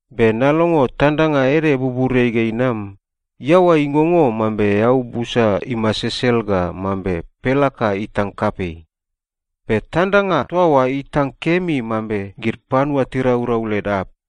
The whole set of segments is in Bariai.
Be nalongo tandanga ede buburiai ga inam, iaoa ingongo mambe eau busa imasesel ga mambe pelaka itang kapei. Be tandanga toa oa itang kemi mambe gid panua tiraurau led arp.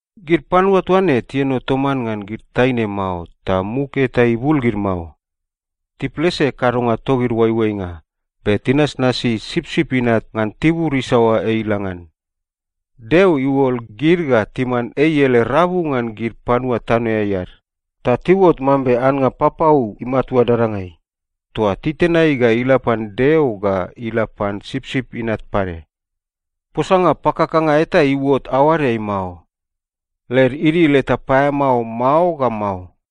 Gid panua toa ne tieno toman ngan gid taine mao ta muk eta ibul gid mao. Tiplese kadonga togid oaioainga, be tinasnasi Sipsip Inat ngan tibur isaoa ei ila ngan. Deo iuol gid ga timan ei ele rabu ngan gid panua tanoeai ad, ta tiuot mambe annga papau imatua dadangai toa titenai ga ila pan Deo ga ila pan Sipsip Inat pade. Posanga pakakanga eta iuot aoadeai mao. Led idil eta paeamao mao ga mao.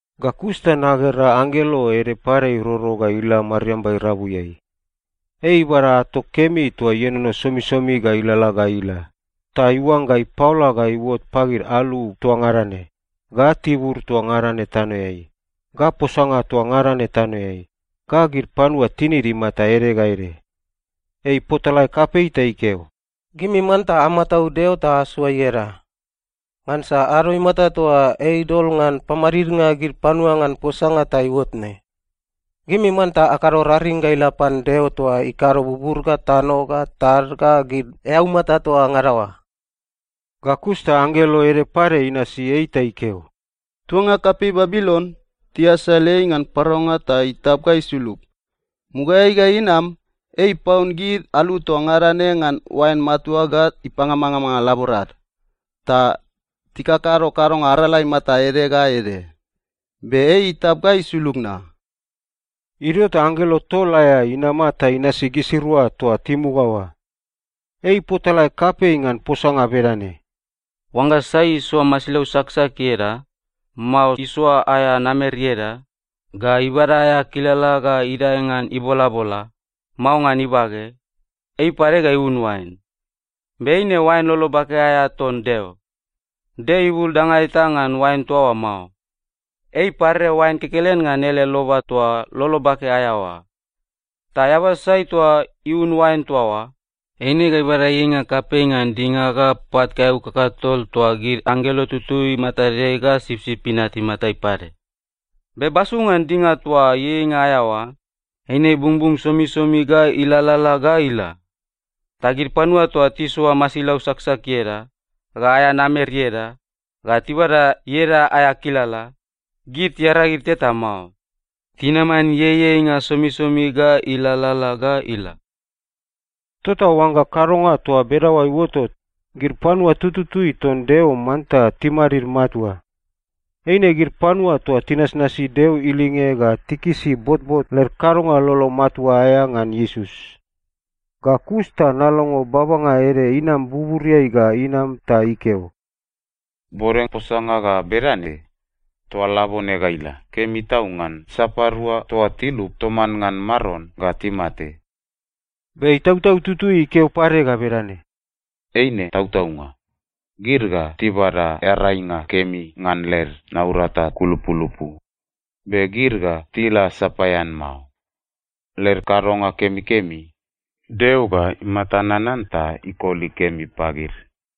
Ga kus ta nagera anggelo ede pade iroro ga ila mariamba irabuiai. Ei ibada ato kemi toa ienono somisomi ga ilalala ga ila, ta iuangga ipaola ga iuot pagid alu toa ngada ne, ga tibur toa ngada ne tanoeai, ga posanga toa ngada ne tanoeai, ga gid panua tinid imata ede ga ede. Ei ipotalae kapei ta ikeo, “Gimi manta amataud Deo ta asoa ieda. Ngansa ado imata toa ei idol ngan pamadidnga gid panua ngan posanga ta iuot ne. Gimi manta akado raring ga ila pan Deo toa ikado bubur ga tano ga tad ga gid eaumata toa ngada oa.” Ga kus ta anggelo ede pade inasi ei ta ikeo, “Tuanga kapei Babilon, tiasal ei ngan paraunga ta itap ga isulug! Mugaeai ga inam, ei ipaun gid alu toa ngada ne ngan oain matua ga ipamangamanga laborad ta tikakado kadonga arala imata ede ga ede. Be ei itap ga isulug na!” Idio ta anggelo tol aea inama ta inasi gisirua toa timuga oa. Ei ipotalae kapei ngan posanga bedane, “Oangga sai isoa masilau saksak ieda, mao isoa aea namer ieda, ga ibada aea kilala ga idae ngan ibolabola, mao ngan ibage, ei pade ga iun oain. Be eine oain lolo bake aea ton Deo. Deo ibul danga eta ngan oain toa oa mao. Ei iparere oain kekelen ngan ele loba toa lolo bake aea oa. Ta eaba sai toa iun oain toa oa, eine ga ibada ieieinga kapei ngan dinga ga pat kaeau kakatol toa gid anggelo tututui matadeai ga Sipsip Inat imatai pade. Be basu ngan dinga toa ieieinga aea oa, eine ibungbung somisomi ga ilalala ga ila. Ta gid panua toa tisoa masilau saksak ieda, ga aea namer ieda, ga tibada ieda aea kilala, gid tiaragid teta mao. Tinaman ieieinga somisomi ga ilalala ga ila.” Tota oangga kadonga toa bedaoa iuotot, gid panua tututui ton Deo manta timadid matua. Eine gid panua toa tinasnasi Deo ilinge ga tikisi botbot led kadonga lolo matua aea ngan Iesus. Ga kus ta nalongo babanga ede inam buburiai ga inam ta ikeo, “Bode posanga ga bedane, ‘Toa labone ga ila, kemi tau ngan sapadua toa tilup toman ngan Maron ga timate.’” Be Itautau Tutui ikeo pade ga bedane, “Eine tautaunga. Gid ga tibada earainga kemi ngan led naurata kulupulupu. Be gid ga tila sapaean mao. Led kadonga kemikemi, Deo ga imata nanan ta ikoli kemi pagid.”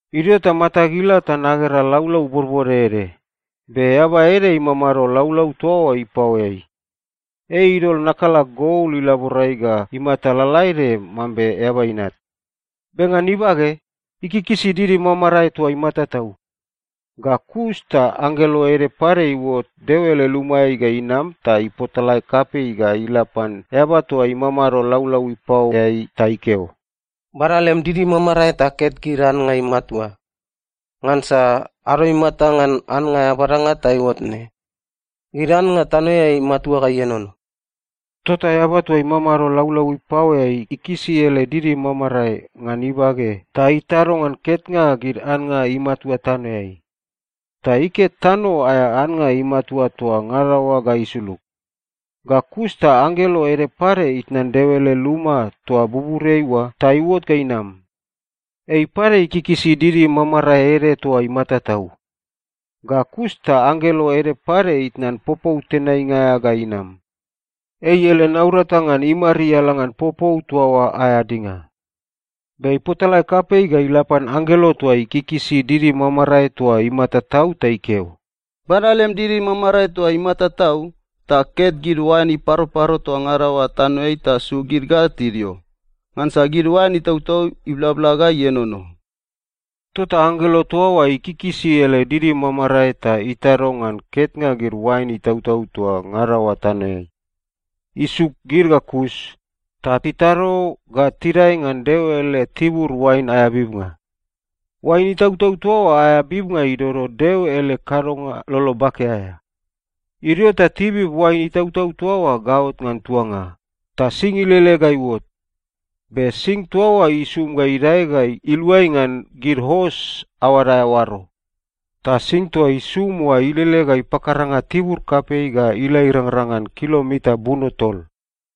Idio ta matag ila ta nagera laulau bodbode ede, be eaba ede imamado laulau toa oa ipaoeai. Ei idol nakala gol ilaborai ga imata lalaede mambe eaba inat. Be ngan ibage, ikikisi didi mamarae toa imata tau. Ga kus ta anggelo ede pade iuot Deo ele lumaeai ga inam ta ipotalae kapei ga ila pan eaba toa imamado laulau ipaoeai ta ikeo, “Bada lem didi mamarae ta ket gid annga imatua. Ngansa ado imata ngan annga aea badanga ta iuot ne. Gid annga tanoeai imatua ga ienono.” Tota eaba toa imamado laulau ipaoeai ikisi ele didi mamarae ngan ibage ta itado ngan ketnga gid annga imatua tanoeai. Ta iket tano aea annga imatua toa ngada oa ga isulug. Ga kus ta anggelo ede pade itnan Deo ele luma toa buburiai oa ta iuot ga inam. Ei pade ikikisi didi mamarae ede toa imata tau. Ga kus ta anggelo ede pade itnan popou tenainga aea ga inam. Ei ele naurata ngan imariala ngan popou toa oa aea dinga. Be ipotalae kapei ga ila pan anggelo toa ikikisi didi mamarae toa imata tau ta ikeo, “Bada lem didi mamarae toa imata tau, ta ket gid oain iparoparo toa ngada oa tanoeai ta suk gid ga tidio. Ngansa gid oain itautau iblabla ga ienono.” Tota anggelo toa oa ikikisi ele didi mamarae ta itado ngan ketnga gid oain itautau toa ngada oa tanoeai. Isuk gid ga kus, ta itado ga tidae ngan Deo ele tibur oain aea bibnga. Oain itautau toa oa aea bibnga idodo Deo ele kadonga lolo bake aea. Idio ta tibib oain itautau toa oa gaot ngan tuanga, ta sing ilele ga iuot. Be sing toa oa isum ga idae ga iluai ngan gid os aoad aea oaro. Ta sing toa isum oa ilele ga ipakaranga tibur kapei ga ila irangrang ngan kilomita buno tol.